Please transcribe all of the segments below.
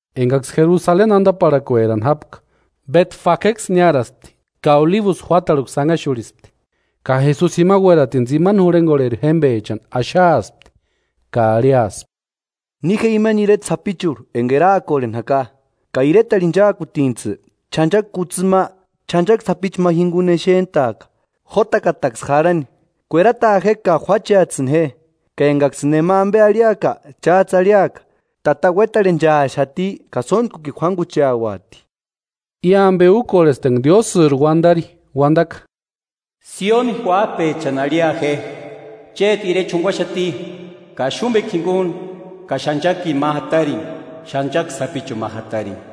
Enkaksï Jerusaleni antaparhakuerani jápka, Betfageksï niáraspti ka Olibusï juátarhuksï anhaxurhispti, ka Jesusi jima uératini tsimani jurhenkorheri jémpechani axaaspti, ka arhiaspti: “Ni je amani ireta sapichurhu enka eraakorheni jaka, ka iretarhu inchaakutintsï, ch'anchaki kutsïni ma, ch'anchaki sapichu ma jinkuni exent'aaka, jotakataksï jarhani, kuerataa je ka juáchets'ïni je. Ka enkaksïni nema ampe arhiaka, cháts'ï arhiaka: ‘Tata uétarhenchaaxati ka sóntkukini juánkucheauati.’” I ampe úkorhesti enka Diósïri uantari uantaka: “Sióni uáp'echani arhia je: Chéti Irecha junkuaxati, kaxumpekua jinkuni ka ch'anchakini ma jatarini, ch'anchaki sapichuni ma jatarini”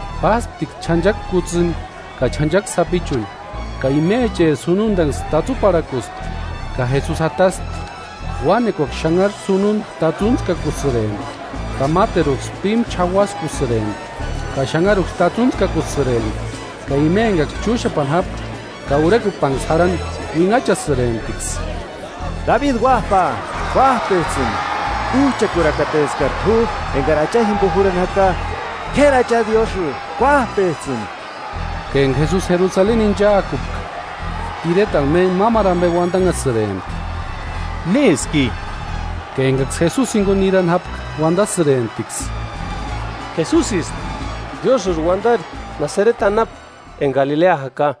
Pásptiksï ch'anchaki kutsïni ka ch'anchaki sapichuni ka imecheri sununtaksï tatsuparhakuspti ka Jesusi jataspti. Uánekuaksï xanharu sununta tatsuntskakusïrempti, ka máteruksï pímu ch'auaxkusïrempti ka xanharuksï tatsuntskasïrempti. Ka ima enkaksï chúxapani jápka ka urhekupanksï jarhani uinhachasïremptiksï: “¡Dabi Uáp'a, kuáp'ets'ïni! ¡Uch'akurakateskari t'u enkari Acha jimpo jurhani jaka! ¡K'éri Acha Diósï, kuáp'ets'ïni!” Ka enka Jesusi Jerusaleni inchaakupka, iretarhu méntku mámaru ampe uantanhasïrempti: “¿Néski i?” Ka enkaksï Jesusi jinkuni nirani jápka uantasïremptiksï: “Jesusisti, Diósïri uantari Nasareti anapu enka Galilea jaka.”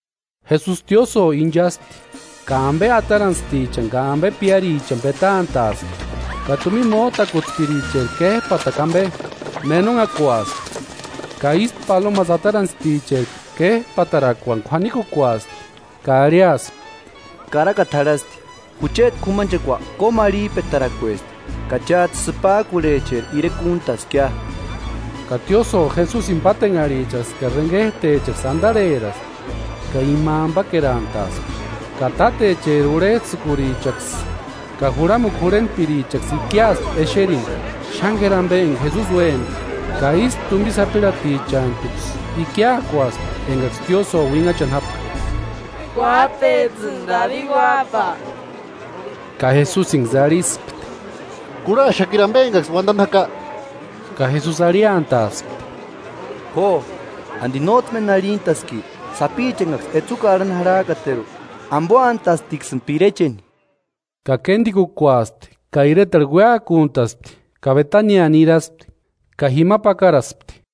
Jesusi tiósïo inchaspti ka ampe atarantstichani ka ampe piárichani petant'a'aspti, ka tumina mót'akutspiricheri kép'atarakua ampe menonhakuaspti, ka ístu palomasï atarantstichani kép'atarakuani k'uanikukuaspti, ka arhiaspti: “Karaka jarhasti: Jucheti k'umanchekua kómarhip'eratarakuesti ka cháts'ï sïpak'urhecheri irekua úntaskia.” Ka tiósïo Jesusini pátenharhichaksï ka renket'echaksï antarheraspti ka ima ampakerantaaspti. Ka tátecheri urhets'ïkurichaksï ka juramukua jurhentpirichaksï ikiaspti exerini xáni k'éri ampe enka Jesusi úempka, ka ístu tumpi sapirhatichantuksï ikiakuaspti enkaksï tiósïo uinhachani jápka: “¡Kuáp'ets'ïni Dabi Uáp'a!” Ka Jesusinksï arhispti: “¿Kurhach'aaxakiri ampe enkaksï uantani jaka?” Ka Jesusi arhiantaaspti: “Jo. ¿Anti nóts'ï méni arhintaski? ‘Sapicha enkaksï etsukua arhani jakateru, ampoantastiksïni pirecheni’” Ka kéntikukuaspti ka iretarhu uéakuntaspti ka Betania niraspti ka jima pakaraspti.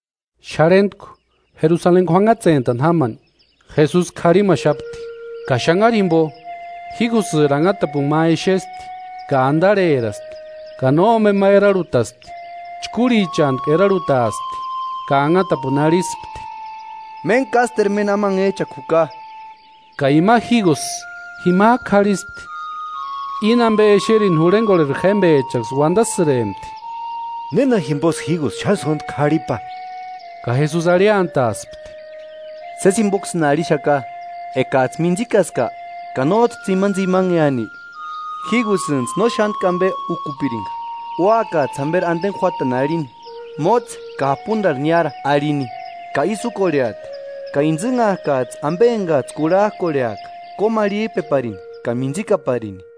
Xarhentku, Jerusaleni k'uanhatsentani jámani, Jesusi karhimaxapti. Ka xanhari jimpo jígusïri anhatapuni ma exespti, ka antarheraspti ka nómpema erarhutaspti, chkúrhichantku erarhutaaspti ka anhatapuni arhispti: “¡Méntku ásteru méni amanhech'akua juka!” Ka ima jígusï jimak'u k'arhispti. Íni ampe exerini, jurhenkorheri jémpechaksï uantasïrempti: “¿Néna jimposï jígusï xáni sóntku k'arhipa?” Ka Jesusi arhiantaaspti: “Sési jimpoksïni arhixaka, ekats'ï mintsikaska ka nóts'ï tsimantsimaneani, jígusïntsï no xántku ampe úkupirinka, úakats'ï jamperi anteni juátani arhini: ‘¡Mótse ka japuntarhu niára!’ Arhini, ka ísï úkorheati. Ka intsïnhak'ats'ï ampe enkats'ï kurhak'orheaka kómarhip'eparini ka mintsikaparini.”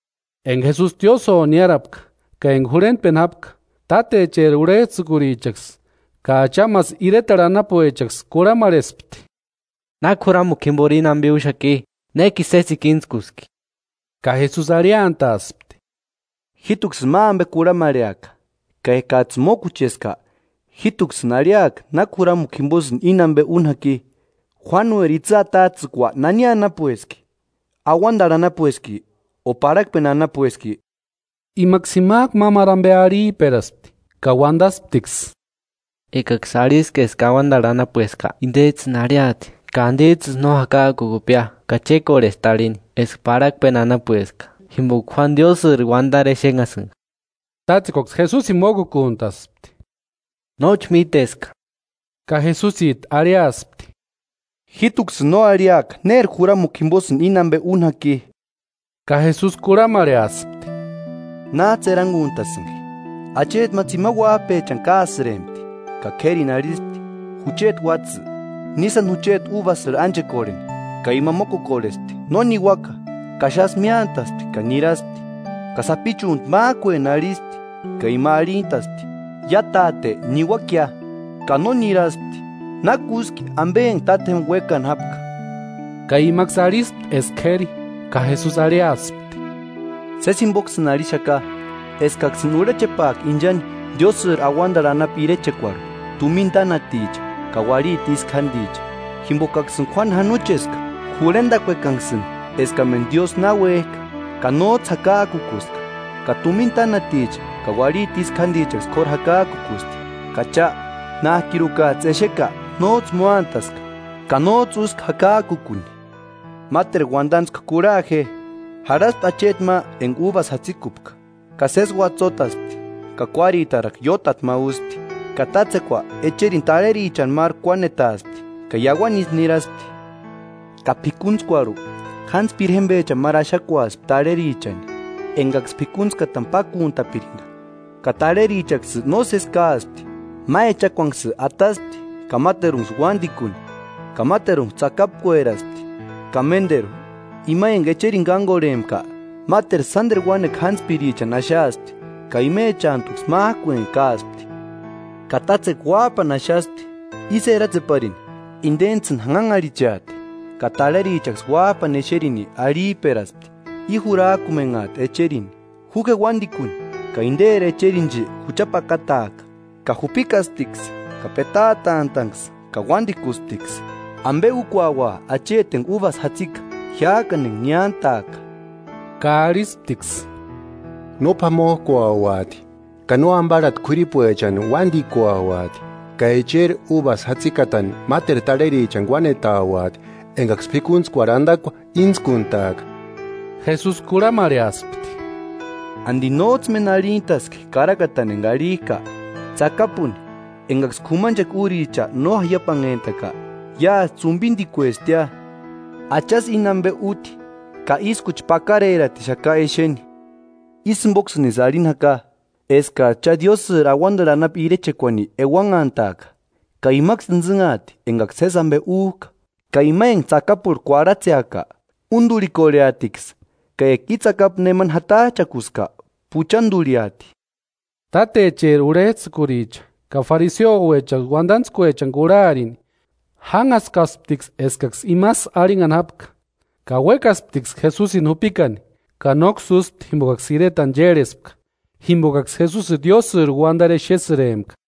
Enka Jesusi tiósïo niárapka ka enka jurhentpeni jápka, tátecheri urhets'ïkurichaksï ka achamasï iretarhu anapuechaksï kurhamarhespti: “¿Náki juramukua jimpori íni ampe úxaki? ¿Nékini sésekua íntskuski?” Ka Jesusi arhiantaaspti: “Jít'uksïni ma ampe kurhamarheaka, ka ekats'ïni mókucheska jít'uksïni arhiaka náki juramukua jimposïni íni ampe úni jaki. ¿Juánueri itsï atats'ïkua nani anapueski? ¿Auantarhu anapueski o parhakpeni anapueski?” Imaksï jimak'u mámaru ampe arhip'eraspti ka uantasptiksï: “Ekaksï arhiska eska auantarhu anapueska, intets'ïni arhiati: ‘¿Ka antits'ïsï no jakak'ukupkia?’ Ka chékorhesti arhini eska parhakpeni anapueska, jimpoka Juánu Diósïri uantari exenhasïnka.” Tátsekuaksï Jesusini mókukuntaspti: “Nóchi míteska.” Ka Jesusit'u arhiaspti: “Jít'uksïni no arhiaka néri juramukua jimposïni íni ampe úni jaki.” Ka Jesusi kurhamarheaspti: “¿Náts'ï erankuntasïnki? Acheti ma tsimani uáp'echani káasïrempti ka k'érini arhispti: ‘Jucheti uátsï, ni sáni jucheti úbasïrhu ánchekorheni.’ Ka ima mókukorhespti: ‘¡No niuaka!’ Ka xásï miántaspti ka niraspti. Ka sapichuntu mák'ueni arhispti ka ima arhintaspti: ‘Ia táte, niuakia.’ Ka no niraspti. ¿Náki úski ampe enka tátjempa uékani jápka?” Ka imaksï arhispti eska k'éri. Ka Jesusi arhiaspti: “Sési jimpoksïni arhixaka, eskaksïni urhechepaaka inchani Diósïri auantarhu anapu irechekuarhu; tumina tánaticha ka uarhiti ísku jánticha. Jimpokaksïni Juánu janocheska jurhentakuekanksïni eskamentu Diósï na uék'a, ka nóts'ï jakak'ukuska, ka tumina tánaticha ka uarhiti ísku jántichaksï k'óru jakak'ukusti. Ka cha, nák'irukats'ï exeka nóts'ï móantaska ka nóts'ï úska jakak'ukuni.” “Máteru uantantskua kurha je: Jarhaspti acheti ma enka úbasï jatsikupka, ka sési uatsotaspti ka kuáritarakua iótati ma úspti, ka tátsekua echerini tarherichani máru kuánetaaspti ka iauani ísï niraspti. Ka p'ikuntskuarhu, jántspiri jémpechani máru axakuaspti tarherichani, enkaksï p'ikuntskatani pákuntapirinka. Ka tarherichaksï nósesi káaspti, ma echakuanksï ataspti ka máterunksï uántikuni ka máterunksï tsakapkueraspti. Ka ménteru, ima enka echerini kánkorhempka, máteru sánteru uánekua jántspichani axaaspti, ka imechantuksï mák'ueni káaspti. Ka tátsekua uáp'ani axaspti ísï eratseparini: Intentsïni janhanharhicheati. Ka tarherichaksï uáp'ani exerini arhip'eraspti: I jurak'umenhaati echerini, ju je uántikuni ka interi echerinchi jucha pakataaka. Ka jupikasptiksï ka petaatant'a'nksï ka uántikusptiksï. ¿Ampe úkuaua acheti enka úbasï jatsika jiák'ani enka niántaaka?” Ka arhisptiksï: “No p'amok'uauati ka no amparhati k'uiripuechani uántikuauati, ka echeri úbasï jatsikatani máteru tarherichani kuánetauati enkaksï p'ikuntskuarhu antakua íntskuntaaka.” Jesusi kurhamarheaspti: “¿Anti nóts'ï méni arhintaski karakatani enka arhik'a? ‘Tsakapuni, enkaksï k'umanchekua úricha no jaiapanhentaka, iásï ts'umpintikuestiia. Achasï íni ampe úti ka ískuchi pakareratixaka exeni.’” “Ísï jimpoksïnisï arhini jaka, eskats'ï cha Diósïri auantarhu anapu irechekuani euanhantaaka, ka imaksï intsïnhaati enkaksï sési ampe úk'a. Ka ima enka tsakapurhu kuarhatseaka, únturhikorheatiksï. Ka eka i tsakapu nemani jatach'akuska puchanturhiati.” Tátecheri urhets'ïkuricha ka fariseuecha uantantskuechani kurharini, jánhaskasptiksï eskaksï imasï arhinhani jápka. Ka uékasptiksï Jesuni jupikani, ka nóksï úspti jimpokaksï iretani chérhespka jimpokaksï Jesusini Diósïri uantarini exesïrempka.